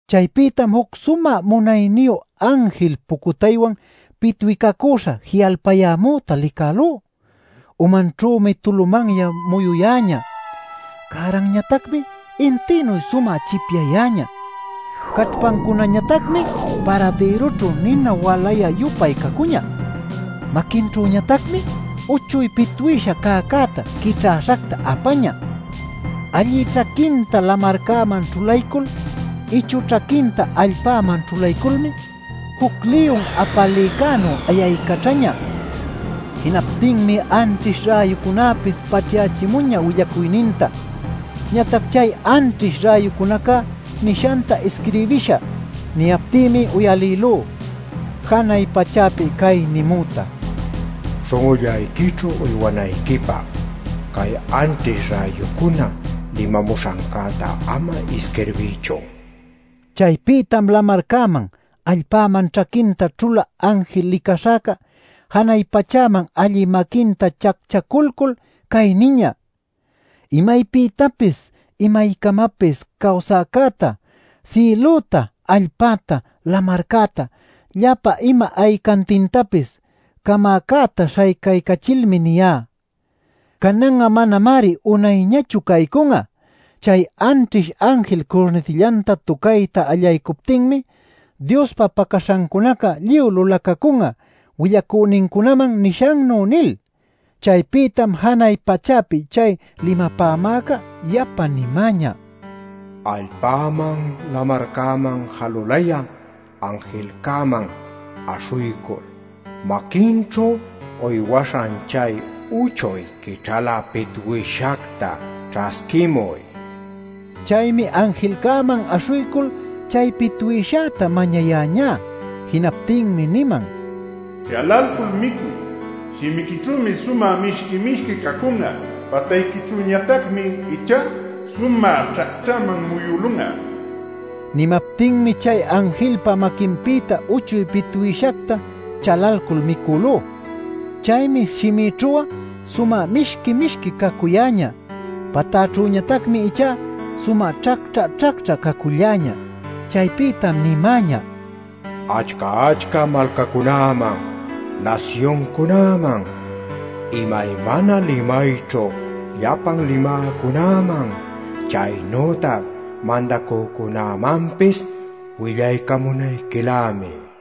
Chaypïtam juc sumä munayniyu anjil pucutaywan pitwicacüśha ji'alpayämüta licälú. Umanćhümi tulumanya muyuyäñä; cäranñatacmi intïnuy sumä chipyayäñä; caćhpancunañatacmi paradïrućhu nina walayä-yupay cacuñä. Maquinćhüñatacmi uchuy pitwïsha cäcäta quićhäśhacta apañä. Allï ćhaquinta lamarcäman ćhulaycul, ichü ćhaquinta allpäman ćhulayculmi juc liyun apalïcänuy ayaycaćhañä. Jinaptinmi anćhish räyucunäpis paćhyächimuñä willacuyninta. Ñatac “chay anćhish räyucunaca nishanta isquirbishä” niyaptïmi uyalïlú janay pachäpi cay nimüta: “Śhun'ullayquićhu uywanayquipä, cay anćhish räyucuna limamuśhanta ama isquirbiychu” nil. Chaypïtam lamarcäman allpäman ćhaquinta ćhulä anjil licaśhäca janay pachäman allï maquinta chacchaculcul cay niñä: “Imaypïtapis imaycamapis cawsäcäta, sïlüta, allpäta, lamarcäta, llapa ima aycantintapis camäcäta śhaycaycachilmi niyá: ¡Canan'a manamari unayñachu caycun'a; Chay anćhish anjilca curnitillanta tucayta allaycuptinmi Diospa pacaśhancunaca lluy lulacacun'a willacünincunaman nishannuy!” nil. Chaypïtam janay pachäpi chay limapämäca yapa nimäñä: “Allpäman lamarcäman jalulayä anjilcäman aśhuycul maquinćhu uywaśhan chay uchuy quićhalä pitwïshacta ćhasquimuy” nil. Chaymi anjilcäman aśhuycul chay pitwïshäta mañayäñá. Jinaptïmi niman: “Chalalcul micuy. Shimiquićhümi sumä mishqui-mishqui cacun'a; patayquićhüñatacmi ichá sumä ćhacćhäman muyülun'a” nil. Nimaptinmi chay anjilpa maquinpïta uchuy pitwïshacta chalalcul micülú. Chaymi shimïćhu'a sumä mishqui-mishqui cacuyäñä; patäćhüñatacmi ichá sumä ćhacćhä-ćhacćhä caculläñä. Chaypïtam nimäñä: “Achca-achca malcacunäman, nasyuncunäman, imaymana limayćhu llapan limäcunäman chaynütac mandacücunämanpis willacamunayquilämi” nil.